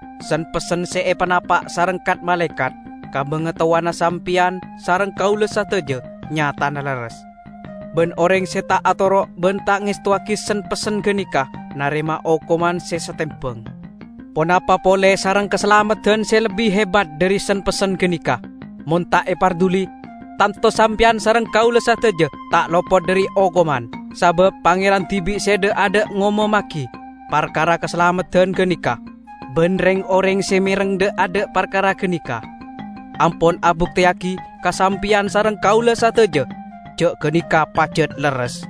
Sen-pessen se epanapa' sareng kat-malaekat ka bangatowana sampeyan sareng kaula sadaja nyatana lerres, ban oreng se ta' atoro' ban ta' ngestowagi sen-pessen ganeka narema okoman se satembang. Ponapa pole sareng kasalameddan se lebbi hebat dhari sen-pessen ganeka! Mon ta' eparduli, tanto sampeyan sareng kaula sadaja ta' lopot dhari okoman. Sabab Pangeran dibi' se dha'-adha' ngomommagi parkara kasalameddan ganeka, ban reng-oreng se mereng dha'-adha' parkara ganeka ampon abukteyagi ka sampeyan sareng kaula sadaja ja' ganeka pajat lerres.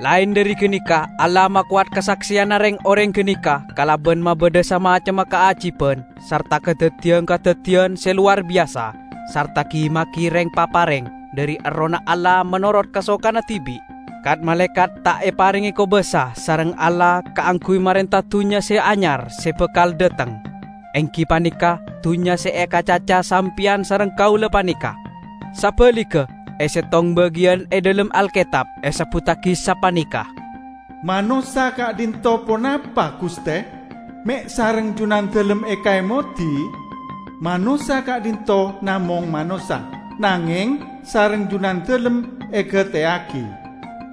Laen dhari ganeka Allah makowat kasakseyanna reng-oreng ganeka kalaban mabadha samacemma kaajiban sarta kadaddiyan-kadaddiyan se lowar biyasa sarta gi-magi reng-papareng dhari Errohna Allah menorot kasokanna dibi'. Kat-malaekat ta' eparenge kobasa sareng Allah kaangguy marenta dunnya se anyar se bakal dhateng, enggi paneka dunnya se ekacaca sampeyan sareng kaula paneka. Sabaligga, e settong bagiyan e dhalem Alketab esebbuttagi sapaneka, "Manossa ka'dhinto' ponapa, Guste, me' sareng Junandalem ekaemodi? Manossa ka'dhinto' namong manossa, nangeng sareng Junandalem egateyagi!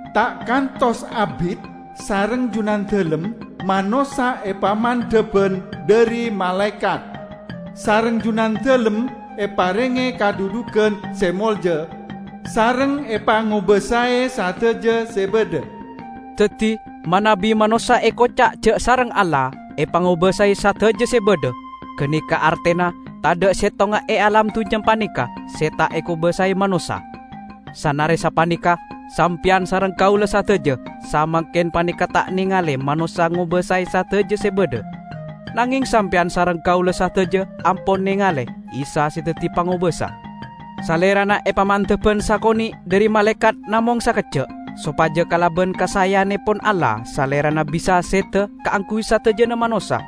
Ta' kantos abit sareng Junandalem manossa epamandhaban dhari malaekat. Sareng Junandalem eparenge kadhudhugan se molja, sareng epangobasae sadaja se badha." Daddi, manabi manossa ekoca' ja' sareng Allah "epangobasae sadaja se badha", ganeka artena tadha' settonga e alam dunnya paneka se ta' ekobasae manossa. Sanare sapaneka, sampeyan sareng kaula sadaja samangken paneka ta' nengale manossa ngobasae sadajana se badha. Nangeng sampeyan sareng kaula sadaja ampon nengale Isa se daddi pangobasa. Salerana epamandhaban sakone' dhari malaekat namong sakejja', sopaja kalaban kasaeyannepon Allah Salerana bisa seda kaangguy sadajana manossa.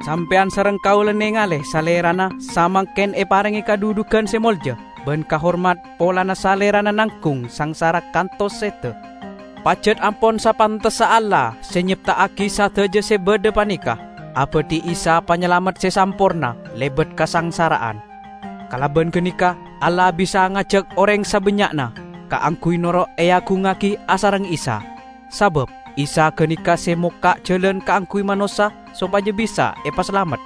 Sampeyan sareng kaula nengale Salerana samangken eparenge kadhudhugan se molja ban kahormat polana Salerana nanggung sangsara kantos seda. Pajat ampon sapantessa Allah -- se nyepta'agi sadaja se badha paneka -- abadhi Isa panyalamet se samporna lebat kasangsara'an. Kalaban ganeka Allah bisa ngajak oreng sabannya'na kaangguy noro' eagungngagi asareng Isa. Sabab Isa ganeka se mokka' jalan kaangguy manossa sopaja bisa epasalamet.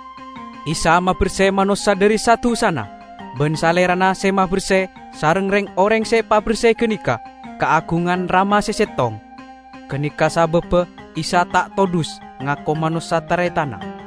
Isa maberse manossa dhari sa-dusana; ban Salerana se maberse, sareng reng-oreng se epaberse ganeka, kaagungan Rama se settong. Ganeka sababba Isa ta' todhus ngako manossa taretanna.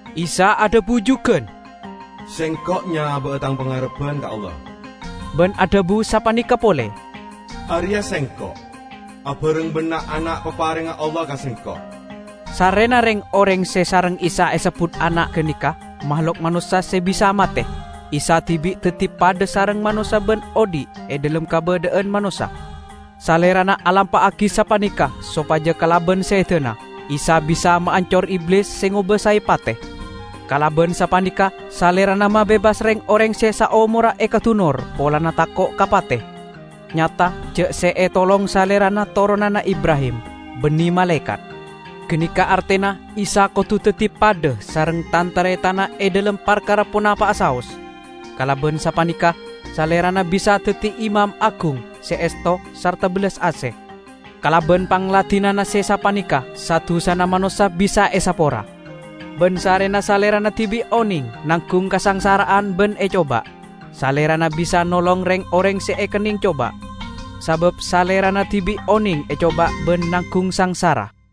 Isa adhabu jugan, "Sengko' nyaba'a Tang pangarebban ka Allah." Ban adhabu sapaneka pole, "Areya' Sengko', abareng ban na'-ana' paparengnga Allah ka Sengko'." Sarrena reng-oreng se sareng Isa esebbut ana' ganeka mahlok manossa se bisa mate, Isa dibi' daddi padha sareng manossa ban odhi' e dhalem kabadha'an manossa. Salerana alampa'agi sapaneka sopaja kalaban sedana, Isa bisa maancor Iblis se ngobasae pate. Kalaban sapaneka Salerana mabebas reng-oreng se saomorra ekadunor polana tako' ka pate. Nyata ja' se etolong Salerana toronanna Ibrahim, banne malaekat. Ganeka artena Isa kodu daddi padha sareng tan-taretanna e dhalem parkara ponapa'a saos. Kalaban sapaneka Salerana bisa daddi Imam Agung se esto sarta bellas ase. Kalaban pangladinanna se sapaneka sa-dusana manossa bisa esapora. Ban sarrena Salerana dibi' oneng nanggung kasangsara'an ban ecoba, Salerana bisa nolong reng-oreng se ekenneng coba, sabab Salerana dibi' oneng ecoba ban nanggung sangsara.